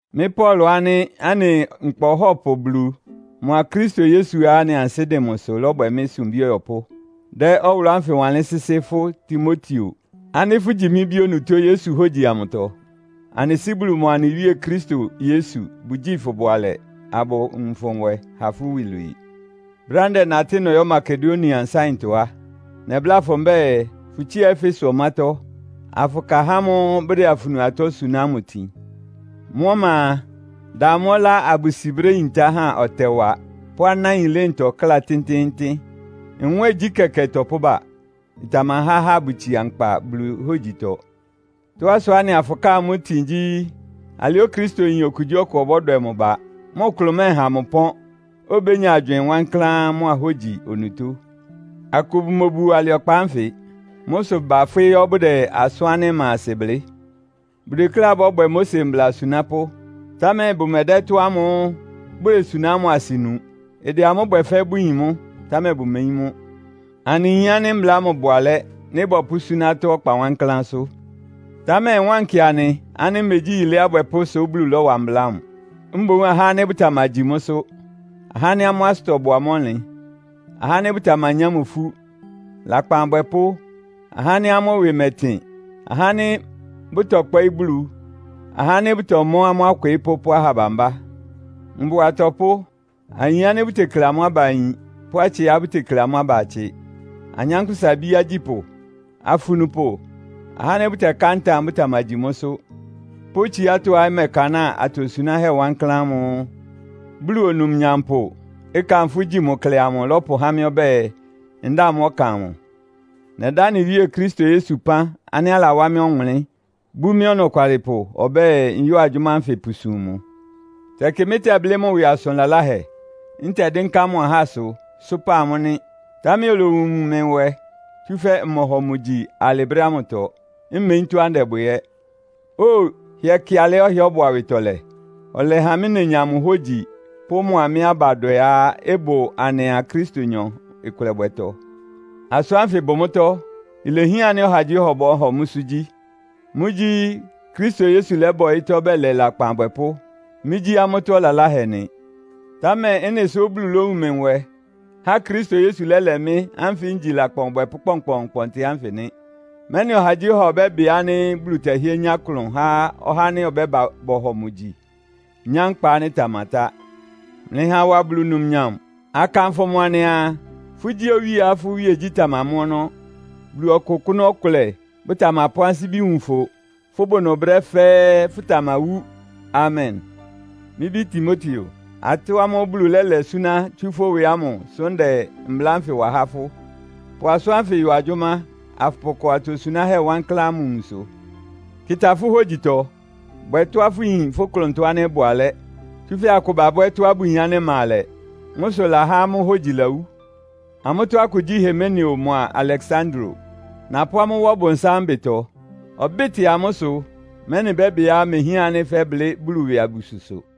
Mɩ́ Paulo ánɩ́ anɩ Nkpa Ɔhɔ́pʋ Bulu mʋa Kristo Yesuá anɩ ansɩ́ dɩn mʋsʋ lɔ́bwɛ mɩ́ sumbí ɔyɔpʋ́, dɛ́ ɔwʋlʋ́ ánfɩ wanlɩ́n sɩ́sɩ́ fʋ́ Timoteo ánɩ́ fʋ́gyi mɩ́ bí onutó Yesu hógyi amʋtɔ. Anɩ Sɩ́ Bulu mʋa anɩ Wíe Kristo Yesu bʋgyíi fʋ bʋalɛ, abʋwun fʋ nwɛ ha fʋ́ iwilwii. Brɛ́á ndɛnatɩ́ nɔyɔ́ Makedonia nsáɩntɔ á, nɛbláa fʋ mbɛ́ɛ, fʋtsía Efeso ɔmátɔ́, afʋka ahá ámʋ́ʋ́ bʋdɛ afunu atɔ́ suná ámʋ itin. Mʋ́ ɔma a, da amʋ́ ɔlá abʋsi brɛ́ yintá há ɔtɛwa pʋ́ anáin ɩlɩ́ntɔ kláa tɩ́ntɩ́ɩ́ntɩ́n. Nwɛ́ɛngyí kɛkɛ ɩtɔpʋ́ba. Ɩtamahá ahá abʋtsia nkpa Bulu hógyitɔ. Tɔ́á sʋá anɩaa fʋkáa amʋ́ itin gyí, alɩá Okristoyin okugyíɔkʋ ɔbɔ́dwɛ mʋ ba, mʋ klʋn mɛ́ɛha mʋ ɩpɔ́n, obénya agywɩɩn wankláán mʋ́a hógyi onutó. Akʋ bʋmobuo alɩ ɔkpa ánfɩ. Mʋ́ sʋ bafwɩ́ yɔ́ bʋdɛ asʋ́n ánɩ́ ɩma asɩ blɩ́. Bʋdekléá bɔ́bwɛ Mose mbla asunápʋ́, támɛ bʋmɛdɛ́ ɩtɔ́ ámʋ́ʋ́ bʋdesuná ámʋ asɩ nu. Ɩdɛ amʋ́ bwɛ fɛ́ bʋyin mʋ́, támɛ bʋmeyín mʋ́. Anɩyin ánɩ́ mbla ámʋ bʋ alɛ́, nɩ́ bɔpʋ́súná atɔ́ ɔkpa wankláánsʋ́. Támɛ ɩwánkɩ anɩ ánɩ́ megyí yilé abwɛpʋ́ sʋ Bulu lɔ́wa mbla ámʋ. Mboún ahá ánɩ́ bʋtamagyi mʋ́sʋ́, ahá ánɩ́ amʋ́ asʋtɔ bʋ amʋ́ ɔnlɩn, ahá ánɩ́ bʋtamanyá mʋ ifú, lakpan abwɛpʋ́, ahá ánɩ́ amʋ́ ɩwɩ mɛ́tɩn, ahá ánɩ́ bʋtɔkpɔ́ɩ́ Bulu, ahá ánɩ́ bʋtɔmɔ́ amʋ́ akwɩɩ́pʋ́ pʋ́ aha bambá, mbʋa atɔpʋ́, ayin ánɩ́ bʋtekle amʋ́ aba ayin pʋ́ atsɩá bʋtekle amʋ́ aba atsɩ, anyánkpʋ́sa ibíá agyípʋ́, afunupʋ, ahá ánɩ́ bɛká ntam bʋtamagyi mʋ́sʋ́ pʋ́ tsiátɔ́á ɩmɛkanáa atosunáhɛ́ wankláán ámʋ́ʋ́ Bulu Onumnyampʋ, ɩkanfʋ́ gyi mʋ klɛ amʋ lɔ́pʋhá mɩ́ ɔbɛ́ɛ, ndáa mʋ́ ɔkan amʋ. Nɛdá anɩ Wíe Kristo Yesu ɩpán ánɩ́ alawá mɩ́ ɔwʋnlɩ́n, bú mɩ́ ɔnɔkwalɩpʋ ɔbɛ́ɛ, nyɔ́ɔ agyʋ́má ánfɩ pʋsum mʋ. Tɛkɩ mɩ́tɛblɩ́ mʋ ɩwɩ asʋn laláhɛ, ntɛdɩ́nká mʋ ahásʋ, sʋ́pa amʋ́ nɩ́. Támɛ olowun mɩ nwɛ, tsúfɛ́ mmɔhɔ mʋ gyi alɩ brɛ́ ámʋtɔ, mmeyín tɔ́á ndɛbwɛ ɛ́. Óo, hɩɛ kɩ alɩá ɔhɩ́ɛ́ ɔbʋ awɩtɔlɛ! Ɔlɛha mɩ́ nenya mʋ hógyi pʋ́ mʋa mɩ́ abadwɛá ɩbʋ anɩa Kristonyɔ ɩkʋlɛbwɛtɔ. Asʋ́n ánfɩ ɩbʋ mʋ́tɔ́, ilehián ánɩ́ ɔhagyíɔha ɔbɔ́hɔ mʋ́sʋ́ gyí. Mʋ́gyí, Kristo Yesu lɛ́ba ɔyɩ́tɔ́ bɛlɛ lakpan abwɛpʋ́. Mɩ́gyí amʋ́tɔ́ ɔlaláhɛ nɩ. Támɛ ɩ́nɩ sʋ Bulu lówun mɩ nwɛ, há Kristo Yesu lɛ́lɛ mɩ́ ánfɩ ngyi lakpan ɔbwɛpʋ́ kpɔnkpɔɔnkpɔntɩ ánfɩ nɩ́. Mɛ́nɩ ɔhagyíɔha ɔbɛ́bɩ ánɩ́ Bulu tɛhɩ́ɛ́ nyá klʋn há ɔhá ánɩ́ ɔbɛ́ba bɔhɔ mʋ gyi, nyá nkpa ánɩ́ ɩtamatá. Mlɩha awa Bulu numnyam, akanfʋ mʋ anɩaa, “Fʋ́gyí Owíeá fʋ́ iwíegyí tamamɔ́ ɔnɔ́. Bulu Ɔkʋkʋ́nʋ́ ɔkʋlɛ, bʋtamapʋ́ ansíbi wun fʋ. Fʋbʋ ɩnʋ brɛ́ fɛ́ɛ́, fʋtamawú! Amen.” Mɩ́ bí Timoteo, atɔ́ ámʋ́ʋ́ Bulu lɛ́lɛ súná tsú fʋ́ ɩwɩ ámʋ sʋ́ ndɛ mbla ánfɩ wa há fʋ́. Pʋ asʋ́n ánfɩ yɔ agyʋ́má, afʋpʋkɔ atosunáhɛ́ wankláán ámʋ nwunsʋ. Kɩta fʋ́ hógyitɔ. Bwɛ tɔ́á fʋyin fʋ́ klʋntɔ ánɩ́ ɩbʋ alɛ́, tsúfɛ́ akʋ babwɛ́ tɔ́á bʋyin ánɩ́ ɩma alɛ. Mʋ́ sʋ ɩlahá amʋ́ hógyi lawú. Amʋ́tɔ́ akʋ gyí Himeneo mʋa Aleksandro. Napʋ́ amʋ́ wá Ɔbʋnsám ɩbɩtɔ. Ɔbɩ́tɩ amʋ́ ɩsʋ, mɛ́nɩ bɛ́bɩá mehián ánɩ́ fɛ́blɩ́ Bulu ɩwɩ abususʋ.